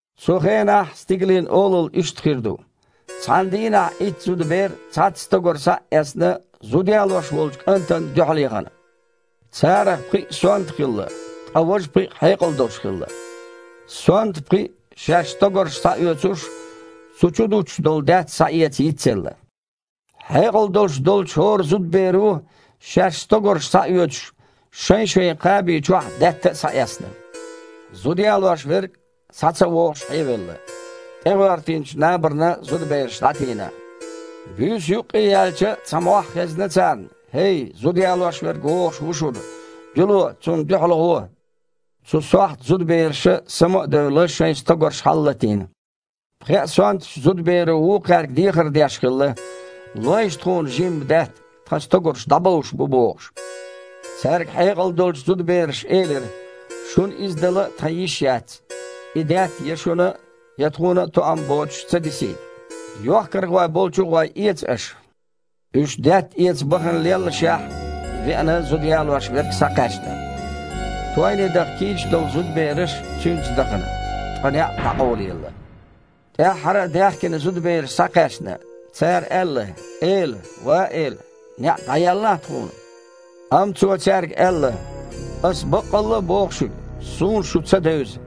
«Цу хенахь Стигалийн Олалла иштта хир ду. Цхьана дийнахь Итт зудабер, цхьацца стогар схьа а эцна, зуда ялош волчу кІантана дуьхьалъяхана. Царах пхиъ сонта хилла, ткъа важа пхиъ хьекъал долуш хилла. Сонта пхиъ, шаьш стогарш схьаоьцуш, цу чу дуттуш долу даьтта схьаэца йицъелла. Хьекъал долуш долчу хІора зудаберо, шаьш стогарш схьаоьцуш, шайн-шайн кхаби чохь даьтта а схьаэцна. Зуда ялош верг, схьа ца вогІуш, хьевелла. ТІегІоьртинчу набарна зудабераш дІатийна. Буьйса юккъе яьлча, цхьа мохь хезна царна: „ХІей, зуда ялош верг вогІуш ву шуна! Дуьйло, цунна дуьхьалгІо!“ Цу сохьта зудабераша, сама а девлла, шайн стогарш хьалалатийна. Пхеа сонтачу зудаберо вукхаьрга дехар деш хилла: „Лойша тхуна жимма даьтта, тхан стогарш дІабовш бу“, – бохуш. Цаьрга хьекъал долчу зудабераша элира: „Шуна иза дала тхан йиш яц, и даьтта я шуна а, я тхуна а тоам боцуш ца дисийта. Йохкархой болчу а гІой, эца аша“. Уьш даьтта эца бахана леллашехь, веана зуда ялош верг схьакхаьчна. Тойне даха кийча долу зудабераш цуьнца дахана, ткъа неІ дІакъовлаелла. ТІаьххьара а даьхкина зудабераш схьакхаьчна. Цара аьлла: „Эла! Ва эла! НеІ дІаеллахьа тхуна!“ Амма Цо цаьрга аьлла: „Аса баккъалла а боху шуьга: суна шу ца девза!“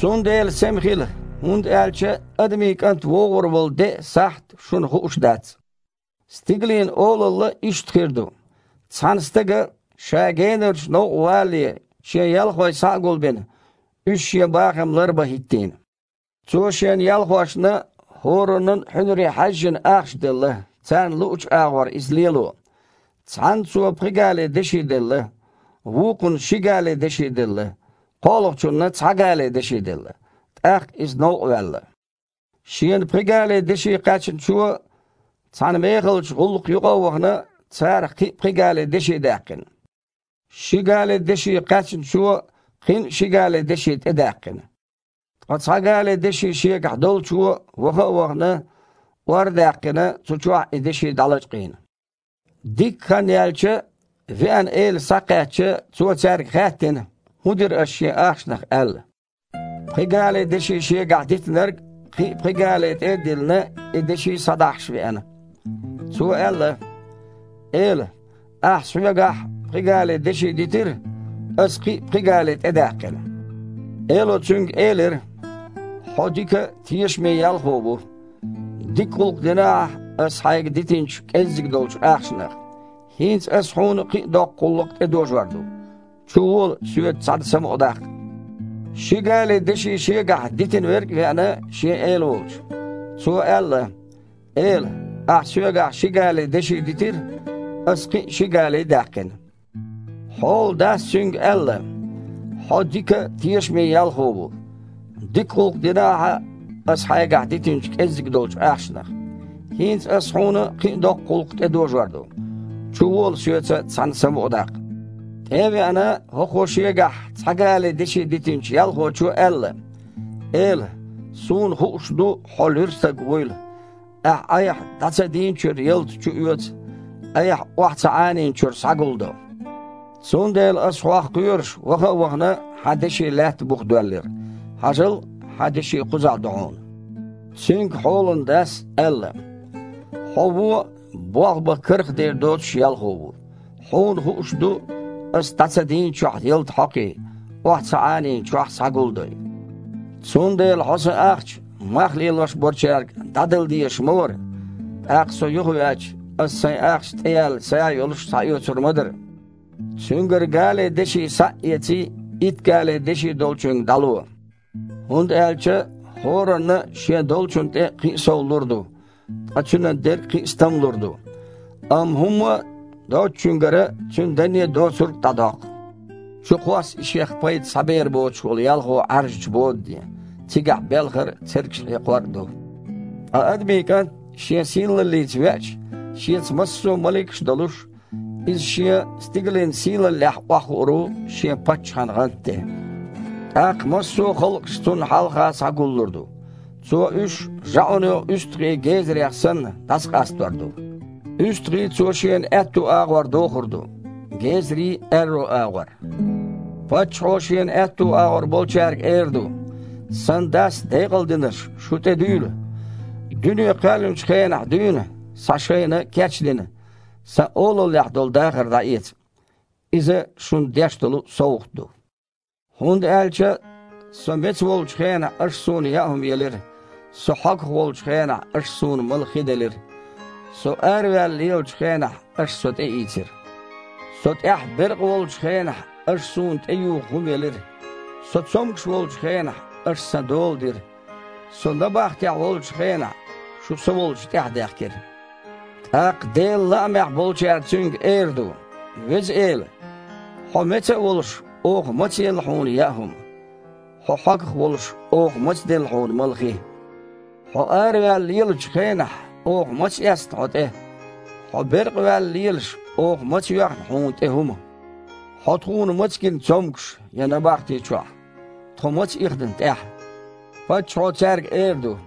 Цундела сема хила, хІунда аьлча Адамийн КІант вогІур волу де а, сахьт а шуна хууш дац». «Стигалийн Олалла иштта хир ду. Цхьана стага, ша генарчу новкъа валале, шен ялхой схьа а гулбина, уьш шен бахам ларбан хІиттийна. Цо шен ялхошна, хІораннан а хьуьнаре хьаьжжина, ахча делла, царна луъучу агІор иза лело. Цхьанна цо пхи гали деши делла, вукхунна ши гали деши делла, кхоалгІачунна цхьа гали деши делла. ТІаккха иза новкъа ваьлла. Шена пхи гали деши кхаьчначо, цхьана мехалчу гІуллакха юккъе а вахана, царах кхин а пхи гали деши даьккхина. Ши гали деши кхаьчначо кхин а ши гали деши тІедаьккхина. Ткъа цхьа гали деши шегахь долчо, ваха а вахана, ор а даьккхина, цу чохь и деши дІалачкъийна. Дикка хан яьлча, веана эла схьакхаьчча, цо цаьрга хаьттина, хІун дира аша шен ахчанах аьлла. Пхи гали деши шегахь дитинарг, кхин а пхи гали тІе а диллина, и деши схьадахьаш веана. Цо аьлла: „Эла, ахьа соьгахь пхи гали деши дитира. Аса кхин а пхи гали тІедаьккхина“. Эло цуьнга элира: „Хьо дика, тешаме ялхо ву. Дика гІуллакх дина ахьа аса хьайгахь дитинчу кІеззиг долчу ахчанах. ХІинца аса хьуна кхин а доккха гІуллакх тІедожор ду. Чувола, соьца цхьаьна самукъадаккха“. Ши гали деши шегахь дитина верг а веана шен эла волчу. Цо аьлла: „Эла, ахьа соьгахь ши гали деши дитира, аса кхин а ши гали даьккхина“. Хьолан дас цуьнга аьлла: „Хьо дика, тешаме ялхо ву. Дика гІуллакх дина ахьа аса хьайгахь дитинчу кІеззиг долчу ахчанах. ХІинца аса хьуна кхин а доккха гІуллакх тІедожор ду. Чувола, соьца цхьаьна самукъадаккха“. ТІе а веана, хІокхо шегахь цхьа гали деши дитинчу ялхочо аьлла: „Эла, суна хууш ду хьо луьра стаг вуйла. Ахьа айхьа дІа ца дийначуьра ялта чуоьцу, айхьа охьа ца Іанийначуьра схьагулдо. Цундела аса, хьох кхоьруш, ваха а вахана, хьан деши лаьтта буха доьллира. Хьажал, хьан деши кхузахь ду хьуна“. Цуьнга хьолан дас аьлла: „Хьо вон а, болх бан кархдер доцуш а ялхо ву. Хьуна хууш ду, аса дІа ца дийначохь ялта хьокхий, охьа ца Іанийначохь схьагулдой. Цундела хьо сан ахча мах лелош болчаьрга дІадала дезаш ма вара. ТІаккха, со юхавеача, аса сайн ахча тІеяьлла са а йолуш схьаоьцур ма дара. Цуьнгара гали деши схьа а эций, итт гали деши долчуьнга дІало. ХІунда аьлча хІоранна а шен долчунна тІе кхин а сов лур ду, ткъа цуьнан дерг кхин а стамлур ду. Амма хІумма а доцучуьнгара цуьнан данне а доцург а дІадоккху. Чукхосса и шех пайда схьабер боцуш волу ялхо Іаьржачу бодане. Цигахь белхар а, цергаш хьекхор а ду“». «Ткъа Адамийн КІант Шен сийлаллица веача, Шеца массо а маликаш а долуш, Иза Шен стигалийн сийлаллехь охьахуур ву Шен паччахьан гІанта тІе. ТІаккха массо а халкъаш Цунна хьалха схьагуллур ду. Цо уьш, жаІуьно уьстагІий гезарех санна, дІасакъастор ду. УьстагІий Цо Шена аьтту агІор дохур ду, гезарий – аьрру агІор. Паччахьо Шена аьтту агІор болчаьрга эр ду: „Сан Дас декъалдинарш, шу тІедуьйла! Дуьне кхоьллинчу хенахь дуьйна схьа шайна кечдина, Сан Олаллехь долу дахар дІаэца. Иза шуна деш долу совгІат ду, хІунда аьлча Со меца волчу хенахь аша Суна яа хІума елира, Со хьогах волчу хенахь аша Суна мала хи делира. Со араваьлла лелачу хенахь аша Со тІеийцира. Со тІехь беркъа волчу хенахь аша Суна тІеюха хІума елира. Со цомгуш волчу хенахь аша Сан дола дира. Со набахтехь волчу хенахь шу Со волчу тІаьхьадаьхкира“. ТІаккха Делан лаамехь болчара Цуьнга эр ду: „Веза Эла! Хьо меца а волуш, оха маца елла хьуна яа хІума? Хьо хьогах а волуш, оха маца делла хьуна мала хи? Хьо араваьлла лелачу хенахь оха маца эцна хьо тІе? Хьо беркъа ваьлла лелаш, оха маца йоьхна хьуна тІе хІума? Хьо тхуна маца гина цомгуш я набахти чохь? Тхо маца ихна тІаьхьа?“ Паччахьо цаьрга эр ду: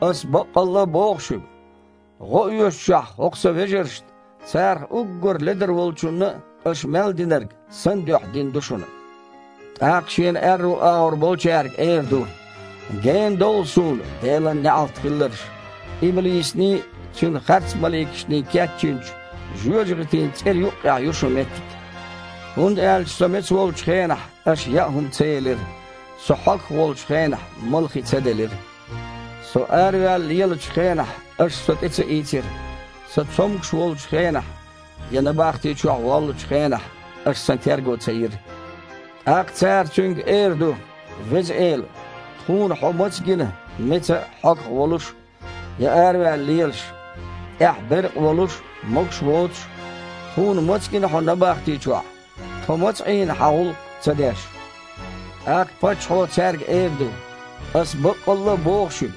„Аса баккъалла а боху шуьга: гІо оьшучохь хІокху Сан вежаршна, царах уггар ледара волчунна а, аша мел динарг Сан дуьхьа дина ду шуна“. ТІаккха Шена аьрру агІор болчаьрга эр ду: „Гена довла Суна, Делан неІалт хилларш! Иблисаний, цуьнан харцмаликашний кечйинчу жоьжахатин цІера юккъехь ю шун меттиг. ХІунда аьлча Со меца волчу хенахь аша яа хІума ца елира, Со хьогах волчу хенахь мала хи ца делира. Со араваьлла лелачу хенахь аша Со тІе ца ийцира. Со цомгуш волчу хенахь, я набахти чохь воллучу хенахь аша Сан терго ца йира“. ТІаккха цара Цуьнга эр ду: „Веза Эла! Тхуна хьо маца гина меца а, хьогах волуш а, я араваьлла лелаш? ТІехь беркъа волуш а, могуш воцуш а? Тхуна маца гина хьо набахти чохь? Тхо маца Іийна Хьан гІуллакх ца деш?“ ТІаккха Паччахьо цаьрга эр ду: „Аса баккъалла а боху шуьга: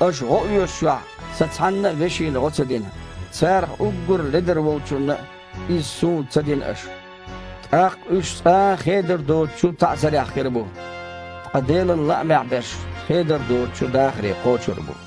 аша гІо оьшучохь Сан цхьанна а вешина гІо ца дина, царах уггар ледара волчунна а, иза Суна ца дина аша“. ТІаккха уьш цкъа а хедар доцучу таІзарехь хир бу, ткъа Делан лаамехь берш хедар доцучу дахаре кхочур бу».